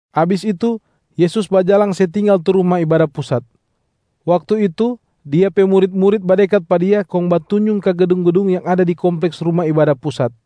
Abis itu Yesus bajalang se tinggal tu Ruma Ibada Pusat. Waktu itu Dia pe murit-murit badekat pa Dia kong batunjung ka gedung-gedung yang ada di kompleks Ruma Ibada Pusat.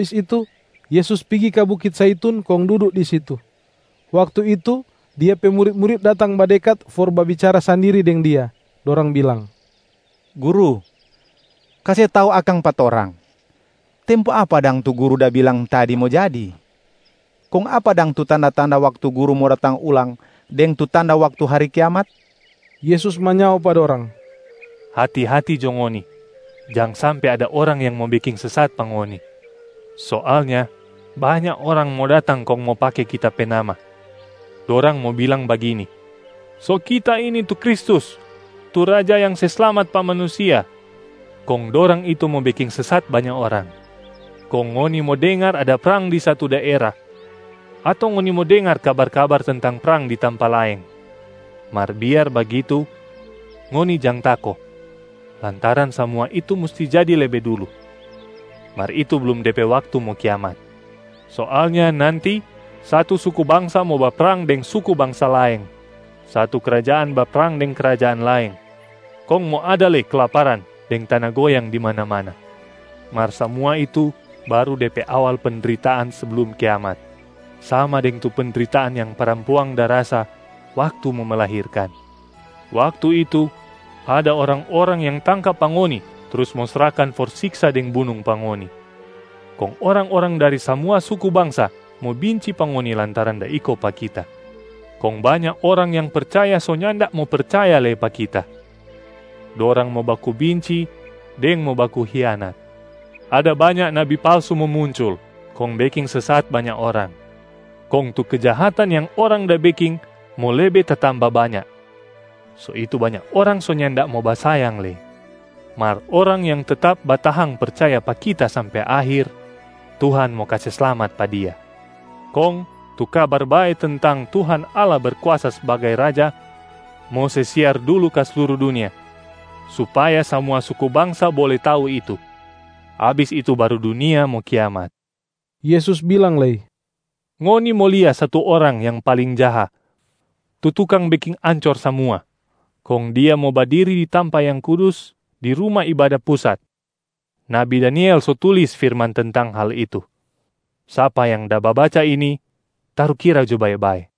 Abis itu, Yesus pigi ka bukit Zaitun kong dudu di situ. Waktu itu Dia pe murit-murit datang badekat for babicara sandiri deng Dia, dorang bilang, “Guru, kase tau akang pa torang, tempo apa dang tu Guru da bilang tadi mo jadi? Kong apa dang tu tanda-tanda waktu Guru mo datang ulang deng tu tanda waktu hari kiamat?” Yesus manyao pa dorang, “Hati-hati jo ngoni, jang sampe ada orang yang mo beking sesat pa ngoni. Soalnya banya orang mo datang kong mo pake Kita pe nama. Dorang mo bilang bagini, ‘So kita ini tu Kristus tu Raja yang se slamat pa manusia’ kong dorang itu mo beking sesat banya orang. Kong ngoni mo dengar ada prang di satu daera, ato ngoni mo dengar kabar-kabar tentang prang di tampa laeng. Mar biar bagitu, ngoni jang tako lantaran samua itu musti jadi lebe dulu, mar itu blum de pe waktu mo kiamat. Soalnya nanti satu suku bangsa mo baprang deng suku bangsa laeng, satu krajaan baprang deng krajaan laeng, kong mo ada lei kelaparan deng tana goyang di mana-mana. Mar samua itu baru de pe awal pendritaan seblum kiamat, sama deng tu pendritaan yang parampuang da rasa waktu mo melahirkan. Waktu itu, ada orang-orang yang tangka pa ngoni trus mo srahkan for siksa deng bunung pa ngoni. Kong orang-orang dari samua suku bangsa mo binci pa ngoni lantaran da iko pa Kita. Kong banya orang yang percaya so nyanda mo percaya lei pa Kita. Dorang mo baku binci deng mo baku hianat. Ada banya nabi palsu mo muncul kong beking sesat banya orang. Kong tu kejahatan yang orang da beking mo lebe tatamba banya, so itu banya orang so nyanda mo basayang lei. Mar orang yang tetap batahang percaya pa Kita sampe akhir, Tuhan mo kase slamat pa dia. Kong tu Kabar Bae tentang Tuhan Allah Berkuasa sbagai Raja mo se siar dulu ka sluru dunia supaya samua suku bangsa bole tau itu, abis itu baru dunia mo kiamat.” Yesus bilang lei, “Ngoni mo lia satu orang yang paling jaha tu tukang beking ancor samua, kong dia mo badiri di tampa yang kudus di Ruma Ibada Pusat. Nabi Daniel so tulis firman tentang hal itu. (Sapa yang da babaca ini, tarukira jo bae-bae!)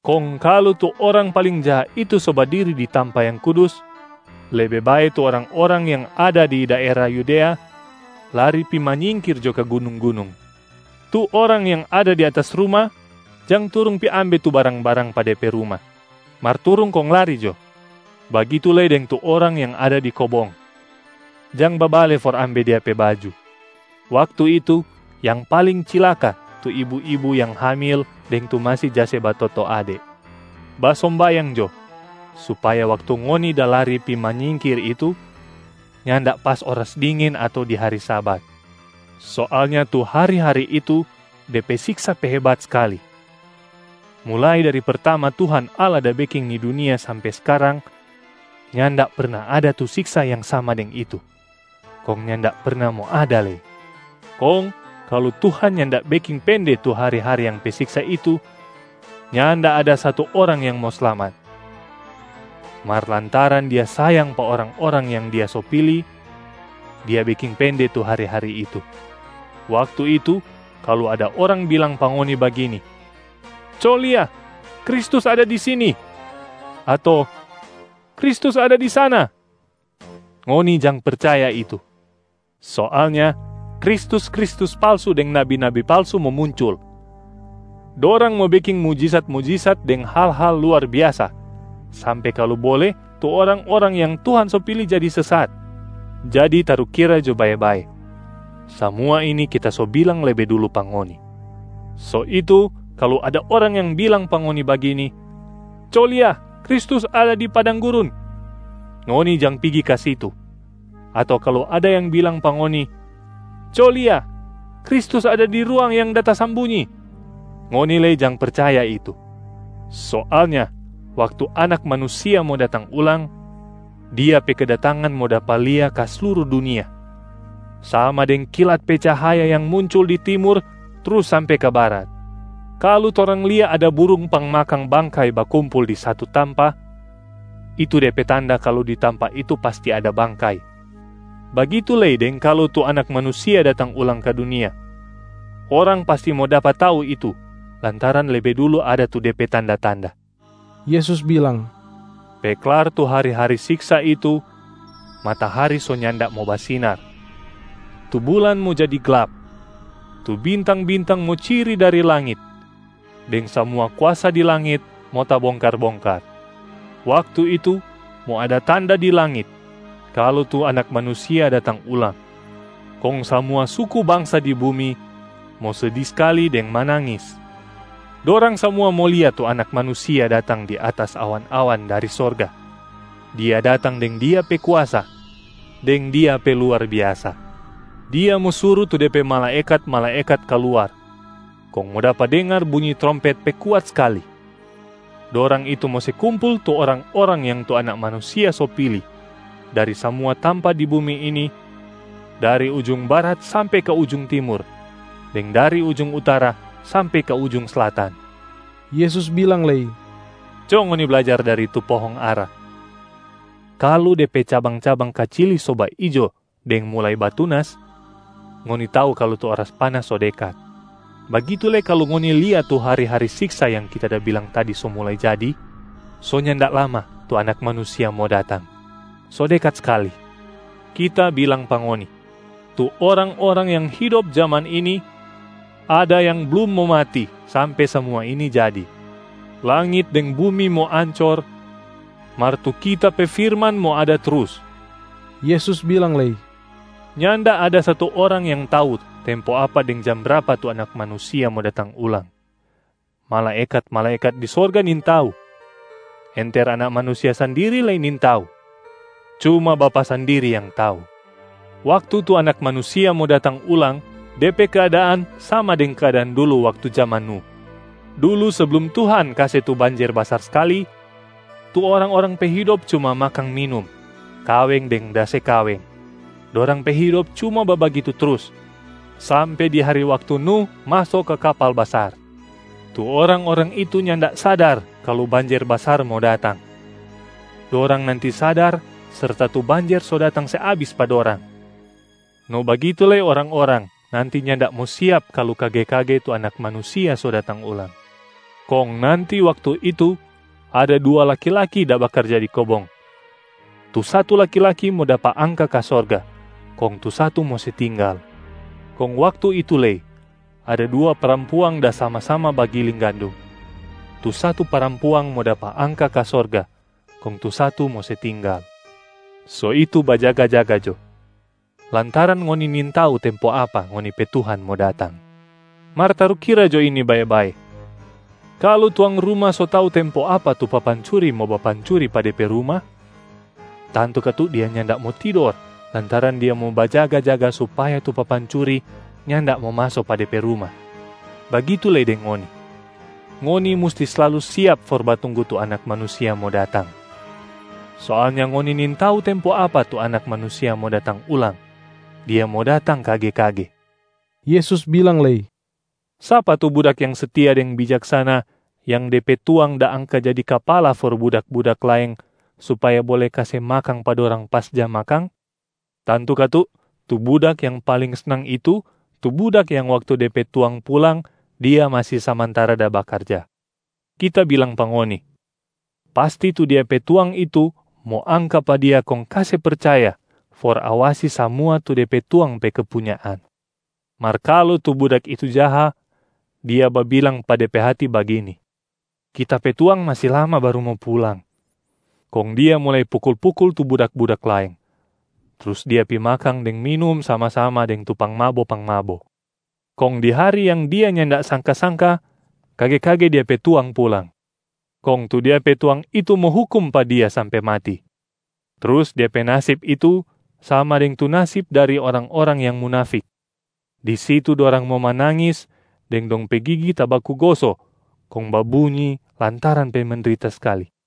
Kong kalu tu orang paling jaha itu so badiri di tampa yang kudus, lebe bae tu orang-orang yang ada di daera Yudea lari pi manyingkir jo ka gunung-gunung. Tu orang yang ada di atas ruma jang turung pi ambe tu barang-barang pa de pe ruma, mar turung kong lari jo. Bagitu lei deng tu orang yang ada di kobong, jang babale for ambe dia pe baju. Waktu itu yang paling cilaka tu ibu-ibu yang hamil deng tu masi ja se batoto ade. Basombayang jo supaya waktu ngoni da lari pi manyingkir itu, nyanda pas oras dingin ato di hari Sabat. Soalnya tu hari-hari itu de pe siksa pe hebat skali, mulai dari pertama Tuhan Allah da beking ni dunia sampe skarang, nyanda perna ada tu siksa yang sama deng itu, kong nyanda perna mo ada lei. Kong kalu Tuhan nyanda beking pende tu hari-hari yang pe siksa itu, nyanda ada satu orang yang mo slamat. Mar lantaran Dia sayang pa orang-orang yang Dia so pili, Dia beking pende tu hari-hari itu. Waktu itu, kalu ada orang bilang pa ngoni bagini, ‘Co lia, Kristus ada di sini!’, ato ‘Kristus ada di sana!’, ngoni jang percaya itu. Soalnya kristus-kristus palsu deng nabi-nabi palsu mo muncul. Dorang mo beking mujisat-mujisat deng hal-hal luar biasa, sampe kalu bole tu orang-orang yang Tuhan so pili jadi sesat. Jadi tarukira jo bae-bae, samua ini Kita so bilang lebe dulu pa ngoni. So itu kalu ada orang yang bilang pa ngoni bagini, ‘Co lia, Kristus ada di padang gurun,’ ngoni jang pigi ka situ. Ato kalu ada yang bilang pa ngoni, ‘Co lia, Kristus ada di ruang yang da tasambunyi,’, ngoni lei jang percaya itu. Soalnya waktu Anak Manusia mo datang ulang, Dia pe kedatangan mo dapa lia ka sluru dunia, sama deng kilat pe cahaya yang muncul di timur trus sampe ka barat. Kalu torang lia ada burung pangmakang bangkai bakumpul di satu tampa, itu de pe tanda kalu di tampa itu pasti ada bangkai, bagitu lei deng kalu tu Anak Manusia datang ulang ka dunia, orang pasti mo dapa tau itu lantaran lebe dulu ada tu de pe tanda-tanda.” Yesus bilang, “Pe klar tu hari-hari siksa itu, matahari so nyanda mo basinar, tu bulan mo jadi glap, tu bintang-bintang mo ciri dari langit, deng samua kuasa di langit mo tabongkar-bongkar. Waktu itu, mo ada tanda di langit kalu tu Anak Manusia datang ulang, kong samua suku bangsa di bumi mo sedi skali deng manangis. Dorang samua mo lia tu Anak Manusia datang di atas awan-awan dari sorga, Dia datang deng Dia pe kuasa deng Dia pe luar biasa. Dia mo suru tu De pe malaekat-malaekat kaluar, kong mo dapa dengar bunyi trompet pe kuat skali. Dorang itu mo se kumpul tu orang-orang yang tu Anak Manusia so pili dari samua tampa di bumi ini, dari ujung barat sampe ka ujung timur, deng dari ujung utara sampe ka ujung slatan.” Yesus bilang lei, “Co ngoni blajar dari tu pohong ara. Kalu de pe cabang-cabang kacili so baijo deng mulai batunas, ngoni tau kalu tu oras panas so dekat. Bagitu lei kalu ngoni lia tu hari-hari siksa yang Kita da bilang tadi so mulai jadi, so nyanda lama tu Anak Manusia mo datang, so dekat skali. Kita bilang pa ngoni, tu orang-orang yang hidop jaman ini ada yang blum mo mati sampe samua ini jadi. Langit deng bumi mo ancor, mar tu Kita pe firman mo ada trus.” Yesus bilang lei, “Nyanda ada satu orang yang tau tempo apa deng jam brapa tu Anak Manusia mo datang ulang. Malaekat-malaekat di sorga nintau, enter Anak Manusia sandiri lei nintau, cuma Bapa sandiri yang tau. Waktu tu Anak Manusia mo datang ulang, de pe keadaan sama deng keadaan dulu waktu jaman Nuh. Dulu seblum Tuhan kase tu banjer basar skali, tu orang-orang pe hidop cuma makang minum, kaweng deng da se kaweng, dorang pe hidop cuma babagitu trus sampe di hari waktu Nuh maso ka kapal basar. Tu orang-orang itu nyanda sadar kalu banjer basar mo datang. Dorang nanti sadar serta tu banjer so datang se abis pa dorang. No bagitu lei orang-orang nanti nyanda mo siap kalu kage-kage tu Anak Manusia so datang ulang. Kong nanti waktu itu ada dua laki-laki da bakarja di kobong, tu satu laki-laki mo dapa angka ka sorga kong tu satu mo se tinggal. Kong waktu itu lei ada dua parampuang da sama-sama bagiling gandum, tu satu parampuang mo dapa angka ka sorga kong tu satu mo se tinggal. So itu bajaga-jaga jo, lantaran ngoni nintau tempo apa ngoni pe Tuhan mo datang. Mar tarukira jo ini bae-bae, kalu tuang ruma so tau tempo apa tu papancuri mo bapancuri pa de pe ruma, tantu katu dia nyanda mo tidor lantaran dia mo bajaga-jaga supaya tu papancuri nyanda mo maso pa de pe ruma. Bagitu lei deng ngoni, ngoni musti slalu siap for batunggu tu Anak Manusia mo datang. Soalnya ngoni nintau tempo apa tu Anak Manusia mo datang ulang, Dia mo datang kage-kage.” Yesus bilang lei, “Sapa tu budak yang setia deng bijaksana, yang de pe tuang da angka jadi kapala for budak-budak laeng, supaya bole kase makang pa dorang pas jam makang? Tantu katu tu budak yang paling snang itu tu budak yang waktu de pe tuang pulang dia masi samantara da bakarja. Kita bilang pa ngoni, pasti tu dia pe tuang itu mo angka pa dia kong kase percaya for awasi samua tu de pe tuang pe kepunyaan. Mar kalu tu budak itu jaha, dia babilang pa de pe hati bagini, ‘Kita pe tuang masi lama baru mo pulang.’ Kong dia mulai pukul-pukul tu budak-budak laeng, trus dia pi makang deng minum sama-sama deng tu pangmabo-pangmabo. Kong di hari yang dia nyanda sangka-sangka, kage-kage dia pe tuang pulang, kong tu dia pe tuang itu mo hukum pa dia sampe mati, trus dia pe nasib itu sama deng tu nasib dari orang-orang yang munafik. Di situ dorang mo manangis deng dong pe gigi tabaku goso kong babunyi lantaran pe mendrita skali.”